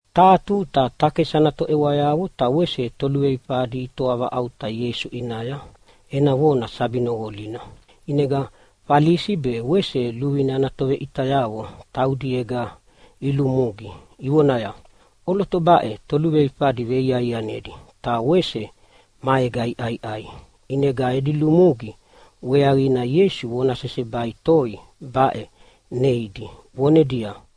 Taha tuta takesi ana toʼewayavo ta wese toluveifadi itoavaʼauta Ieisu ʼinaya ena vona sabi noqolina. ʼInega Falisi be wese luvine ana toveʼitayavo taudiega ilulumugi ivonaya, “ʼOloto baʼe toluveifadi veiaianedi ta wese maega iʼaiʼai.” ʼInega edi lumugi weaqina Ieisu vona sesebai toi baʼe neidi vonedia,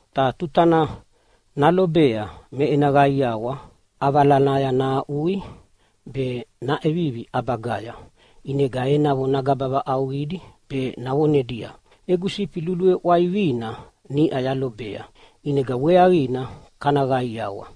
Ta tutana nalobea me ena qaiawa ʼavalanaya nahaʼui be naʼevivi ʼabagaya. ʼInega enavo nagaba vaʼauqidi be navonedia, ‘Egu sifi luluveʼwaivina niʼa yalobea, ʼinega weaqina kana qaiawa.’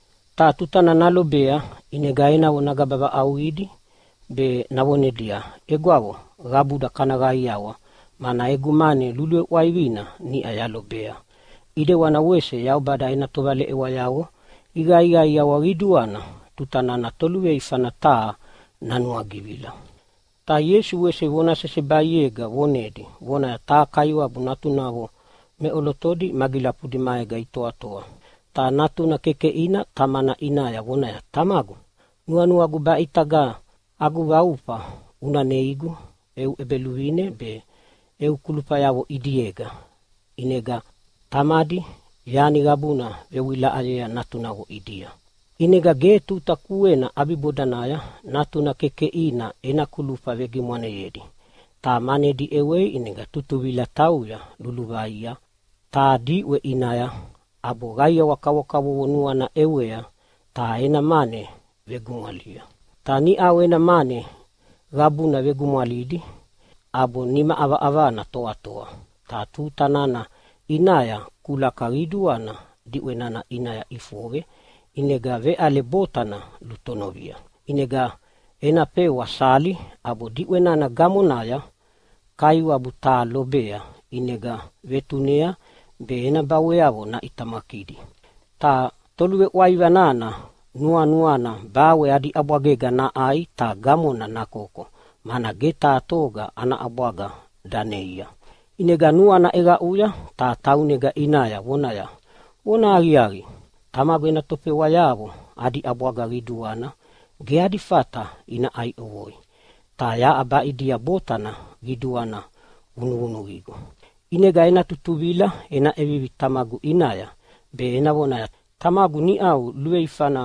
Ta tutana nalobea ʼinega enavo nagaba vaʼauqidi be navonedia, ‘Egwavo, qabuda kana qaiawa, mana egu mane luluveʼwaivina niʼa yalobea!’ ʼEdewana wese Yaubada ena tovaleʼewayavo iqaiqaiawa qiduana tuta nana toluveifana taha nanuagivila.” Ta Ieisu wese vona sesebaiega vonedi vonaya, “Taha kaiwabu natunavo meʼolotodi magilafudi maega itoatoa, ta natuna kekeʼina tamana ʼinaya vonaya, ‘Tamagu, nuanuagu baʼe ʼitaga agu vaufa una neigu eu ʼebeluvine be eu kulufayavo ʼidiega.’ ʼInega tamadi yani qabuna vewilaʼayea natunavo ʼidia. “ʼInega ge tuta kuena ʼabibodanaya natuna kekeʼina ena kulufa vegimwaneyedi ta manedi ʼewei. ʼInega tutuvila tauya luluvaia taha diʼwe ʼinaya, ʼabo qaiawa kavokavovo nuana ʼewei ta ena mane vegumwalia. Ta niʼau ena mane qabuna vegumwalidi ʼabo nima ʼavaʼavana toatoa. Ta tuta nana ʼinaya kulaka qiduana diʼwe nana ʼinaya ʼifoqe, ʼinega veʼale botana lutonovia. “ʼInega ena fewa sali ʼabo diʼwe nana gamonaya kaiwabu taha lobea, ʼinega vetunea be ena baweavo naʼitamakidi. Ta toluveʼwaiva nana nuanuana bawe adi ʼabwagega naʼai ta gamona nakoko, mana ge taha toga ana ʼabwaga daneia. “ʼInega nuana ʼeqaʼuya ta taunega ʼinaya vonaya, ‘Vonahaqiaqi, tamagu ena tofewayavo adi ʼabwaga qiduana ge adi fata ina ʼai ʼovoi, ta yaʼa baʼidia botana qiduana vunuvunuqigu. ʼInega ena tutuvila ena ʼevivi tamagu ʼinaya be ena voneaya, “Tamagu, niʼau luveifana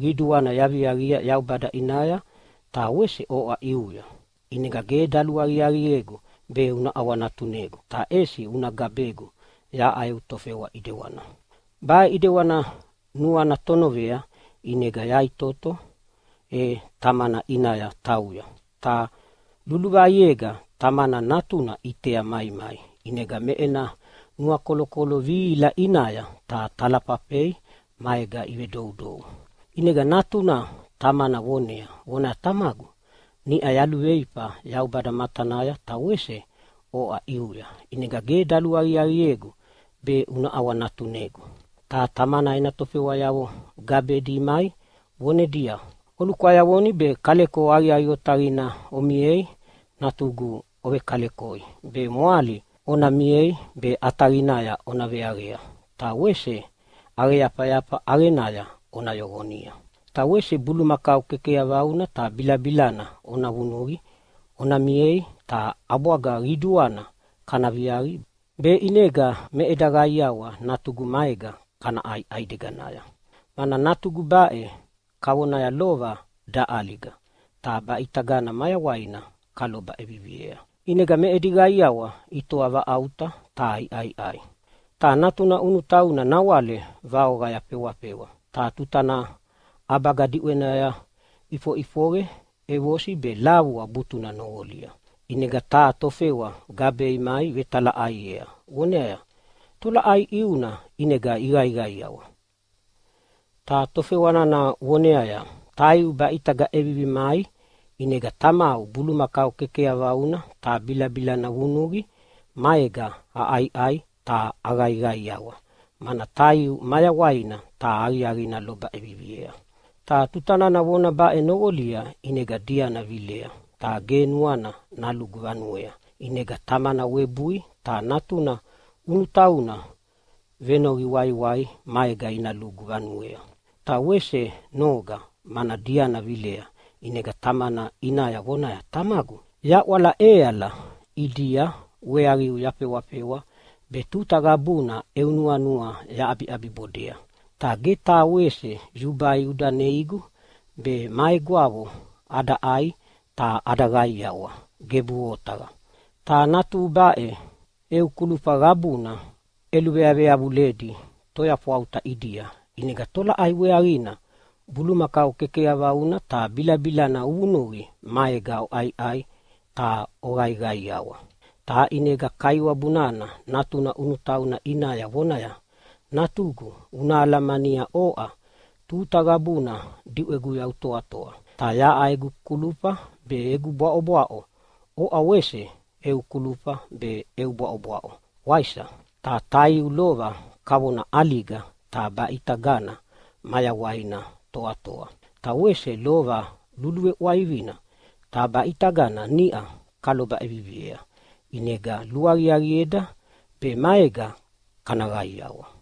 qiduana yaviaqia Yaubada ʼinaya ta wese oʼa ʼiuya. ʼInega ge daluaqiaqiegu be una ʼawanatunegu ta ʼesi una gabegu yaʼa eu tofewa ʼidewana.” ’ “Baʼe ʼidewana nuana tonovea, ʼinega yaʼitoto e tamana ʼinaya tauya. Ta luluvaiega tamana natuna ʼitea maimai. ʼInega me ena nuakolokolo vihila ʼinaya ta talafafei maega ivedoudou. “ʼInega natuna tamana vonea vonaya, ‘Tamagu, niʼau yaluveifa Yaubada matanaya ta wese oʼa ʼiuya, ʼinega ge daluaqiaqiegu be una ʼawanatunegu.’ “Ta tamana ena tofewayavo gabedi imai vonedia, ‘Olukwayavoni be kaleko aqiaqi otaqina omiei natugu ona vekalekoi be mwali ona miei be ʼataqinaya ona veaqea. Ta wese ʼaqeyafayafa ʼaqenaya ona yoqonia. Ta wese bulumakau kekeyavauna ta bilabilana ona vunuqi ona miei ta ʼabwaga qiduana kana viaqi, be ʼinega me eda qaiawa natugu maega kana ʼai ʼaideganaya. Mana natugu baʼe kavonaya lova daʼaliga, ta baʼitagana mayawaina kaloba ʼeviviea.’ ʼInega me edi qaiawa itoa vaʼauta ta iʼaiʼai. “Ta natuna ʼunutauna nawale vaoqaya fewafewa, ta tutana ʼabaga diʼwenaya ʼifoʼifoqe ʼevosi be lavua butuna noqolidi. ʼInega taha tofewa gabei mai vetalaʼaiea voneaya, ‘Tolaʼai ʼiuna ʼinega iqaiqaiawa?’ “Ta tofewa nana voneaya, ‘Taiu baʼe ʼitaga ʼevivi mai ʼinega tamau bulumakau kekeyavauna ta bilabilana vunuqia maega aʼaiʼai ta aqaiqaiawa, mana taiu mayawaina ta aqiaqina loba ʼeviviea.’ “Ta tuta nana vona baʼe noqolia ʼinega diana vilea ta ge nuana nalugu vanuea. ʼInega tamana webui ta natuna ʼunutauna venoqi waiwai maega ina lugu vanuea. Ta wese noga mana diana vilea, ʼinega tamana ʼinaya vonaya, ‘Tamagu, yaʼwala ʼeala ʼidia weaqiu yafewafewa be tuta qabuna eu nuanua yaʼabibodea. Ta ge taha wese yubai uda neigu be ma egwavo ada ʼai ta ada qaiawa. Gebuʼe otaqa! Ta natuhu baʼe eu kulufa qabuna ʼeluveyaveyavuledi toyafwauta ʼidia, ʼinega tolaʼai weaqina bulumakau kekeyavauna ta bilabilana uvunuqi maega oʼaiʼai ta oqaiqaiawa?’ “Ta ʼinega kaiwabu nana natuna ʼunutauna ʼinaya vonaya, ‘Natugu una alamania, oʼa tuta qabuna diʼweguya utoatoa, ta yaʼa egu kulufa be egu bwaʼobwaʼo oʼa wese eu kulufa be eu bwaʼobwaʼo, waisa? Ta taiu lova kavona ʼaliga ta baʼe ʼitaga mayawaina toatoa, ta wese lova luluveʼwaivina ta baʼe ʼitagana niʼa kaloba ʼeviviea. ʼInega luaqiaqieda be maega kana qaiawa.’”